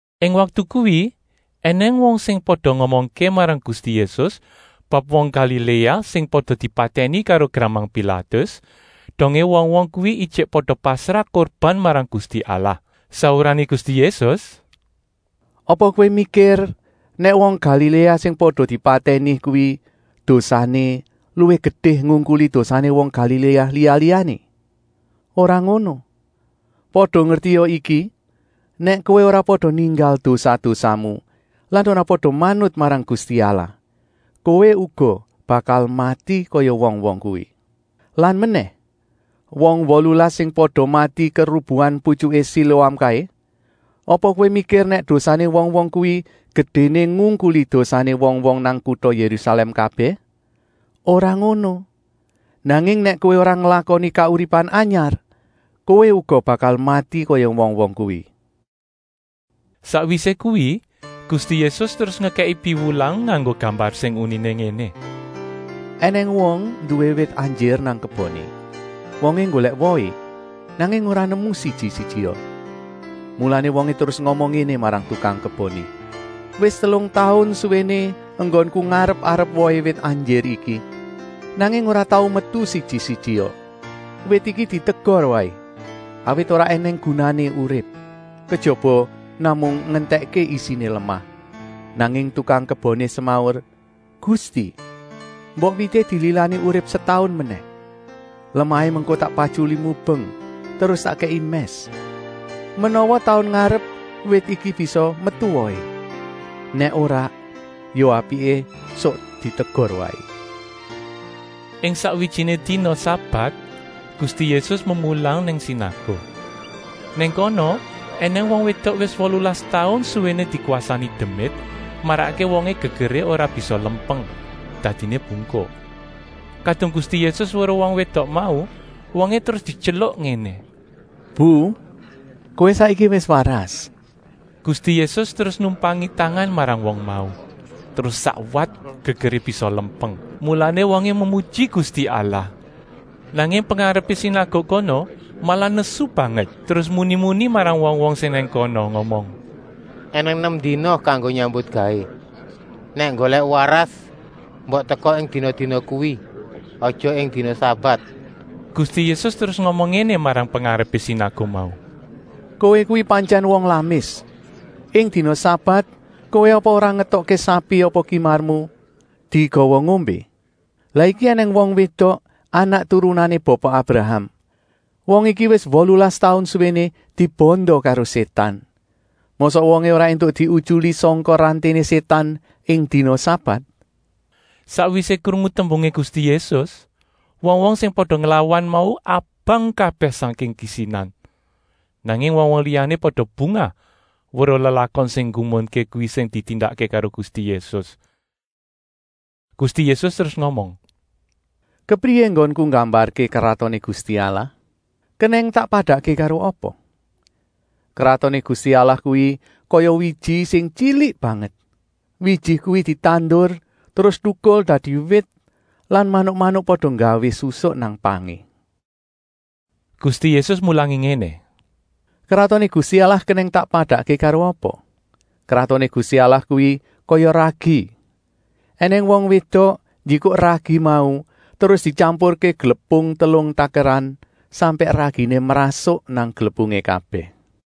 Ing waktu kuwi ènèng wong sing pada ngomongké marang Gusti Yésus bab wong Galiléa sing pada dipatèni karo gramang Pilatus, dongé wong-wong kuwi ijik pada pasrah kurban marang Gusti Allah. Saurané Gusti Yésus: “Apa kowé mikir nèk wong Galiléa sing pada dipatèni kuwi dosané luwih gedé ngungkuli dosané wong Galiléa liya-liyané? Ora ngono! Pada ngertia iki, nèk kowé ora pada ninggal dosa-dosamu lan ora pada manut marang Gusti Allah, kowé uga bakal mati kaya wong-wong kuwi. Lan menèh, wong wolulas sing pada mati kerubuhan putyuké Siloam kaé, apa kowé mikir nèk dosané wong-wong kuwi gedéné ngungkuli dosané wong-wong nang kuta Yérusalèm kabèh? Ora ngono! Nanging nèk kowé ora nglakoni kauripan anyar, kowé uga bakal mati kaya wong-wong kuwi.” Sakwisé kuwi, Gusti Yésus terus ngekèki piwulang nganggo gambar sing uniné ngéné: “Enèng wong nduwé wit anjir nang keboné. Wongé nggolèk wohé, nanging ora nemu siji-sijia. Mulané wongé terus ngomong ngéné marang tukang keboné: ‘Wis telung taun suwéné enggonku ngarep-arep wohé wit anjir iki, nanging ora tau metu siji-sijia. Wit iki ditegor waé, awit ora ènèng gunané urip, kejaba namung ngentèkké isiné lemah!’ Nanging tukang keboné semaur: ‘Gusti, mbok wité dililani urip setaun menèh. Lemahé mengko tak patyuli mubeng, terus tak kèki mès. Menawa taun ngarep wit iki bisa metu wohé. Nèk ora, ya apiké suk ditegor waé.’” Ing sakwijiné dina sabat Gusti Yésus memulang nang sinaguk. Nang kono ènèng wong wédok wis wolulas taun suwéné dikwasani demit, marakké wongé gegeré ora bisa lempeng, dadiné bungkuk. Kadung Gusti Yésus weruh wong wédok mau, wongé terus dityeluk ngéné: “Bu, kowé saiki wis waras!” Gusti Yésus terus numpangi tangan marang wong mau, terus sakwat gegeré bisa lempeng, mulané wongé memuji Gusti Allah. Nanging pengarepé sinaguk kono malah nesu banget, terus muni-muni marang wong-wong sing nang kono, ngomong: “Enèng nem dina kanggo nyambutgawé. Nèk nggolèk waras, mbok teka ing dina-dina kuwi. Aja ing dina sabat.” Gusti Yésus terus ngomong ngéné marang pengarepé sinaguk mau: “Kowé kuwi pantyèn wong lamis. Ing dina sabat kowé apa ora ngetokké sapi apa kimarmu digawa ngombé? Lah iki ènèng wong wédok anak turunané Bapa Abraham. Wong iki wis wolulas taun suwéné dibanda karo Sétan. Mosok wongé ora éntuk diutyuli sangka ranténé Sétan ing dina sabat?” Sakwisé krungu tembungé Gusti Yésus, wong-wong sing pada nglawan mau abang kabèh sangking kisinan. Nanging wong-wong liyané pada bungah weruh lelakon sing nggumunké kuwi sing ditindakké karo Gusti Yésus. Gusti Yésus terus ngomong: “Kepriyé enggonku nggambarké Kratoné Gusti Allah? Kenèng tak padakké karo apa? Kratoné Gusti Allah kuwi kaya wiji sing tyilik banget. Wiji kuwi ditandur terus tukul dadi wit lan manuk-manuk pada nggawé susuk nang pangé.” Gusti Yésus mulangi ngéné: “Kratoné Gusti Allah kenèng tak padakké karo apa? Kratoné Gusti Allah kuwi kaya ragi. Enèng wong wédok njikuk ragi mau terus dityampurké glepung telung takeran, sampèk raginé mrasuk nang glepungé kabèh.”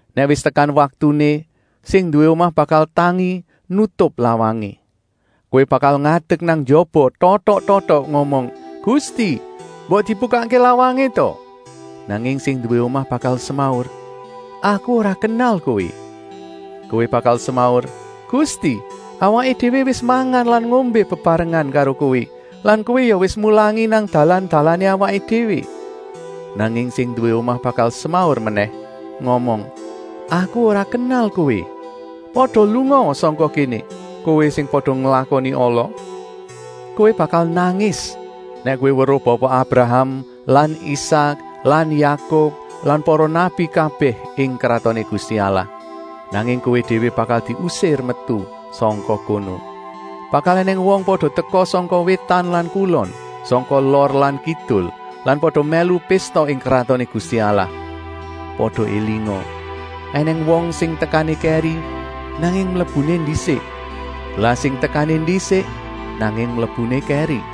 Nèk wis tekan waktuné, sing nduwé omah bakal tangi nutup lawangé. Kowé bakal ngadek nang njaba totok-totok, ngomong: ‘Gusti, mbok dibukakké lawangé ta!’ Nanging sing nduwé omah bakal semaur: ‘Aku ora kenal kowé!’ Kowé bakal semaur: ‘Gusti, awaké déwé wis mangan lan ngombé bebarengan karo Kowé lan Kowé ya wis mulangi nang dalan-dalané awaké déwé!’ Nanging sing nduwé omah bakal semaur menèh, ngomong: ‘Aku ora kenal kowé! Pada lungaa sangka kéné, kowé sing pada nglakoni ala!’ Kowé bakal nangis nèk kowé weruh Bapa Abraham lan Isak lan Yakub lan para nabi kabèh ing Kratoné Gusti Allah, nanging kowé déwé bakal diusir metu sangka kono. Bakal ènèng wong pada teka sangka wétan lan kulon, sangka lor lan kidul lan pada mèlu pésta ing Kratoné Gusti Allah. Pada élinga, ènèng wong sing tekané kèri, nanging mlebuné ndisik, lah sing tekané ndisik, nanging mlebuné kèri.”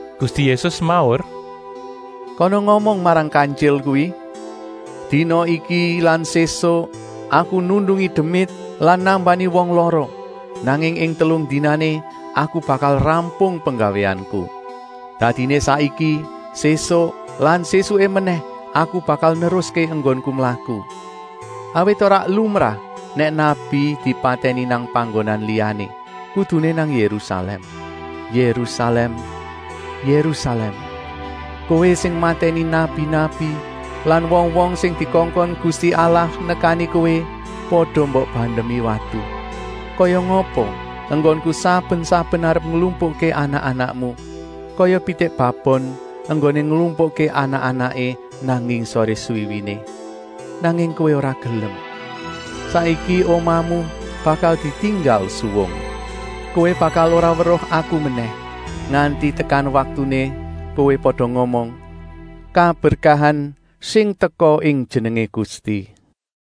Gusti Yésus semaur: “Kana ngomong marang kantyil kuwi: ‘Dina iki lan sésuk Aku nundungi demit lan nambani wong lara, nanging ing telung dinané Aku bakal rampung penggawéanku.’ Dadiné saiki, sésuk lan sésuké menèh Aku bakal neruské enggonku mlaku. Awit ora lumrah nèk nabi dipatèni nang panggonan liyané, kuduné nang Yérusalèm. “Yérusalèm, Yérusalèm! Kowé sing matèni nabi-nabi lan wong-wong sing dikongkon Gusti Allah nekani kowé pada mbok bandemi watu. Kaya ngapa enggonku saben-saben arep nglumpukké anak-anakmu, kaya pitik babon enggoné nglumpukké anak-anaké nang ngisoré swiwiné. Nanging kowé ora gelem. Saiki omahmu bakal ditinggal suwung. Kowé bakal ora weruh Aku menèh, nganti tekan waktuné kowé pada ngomong: ‘Kaberkahan sing teka ing jenengé Gusti!’”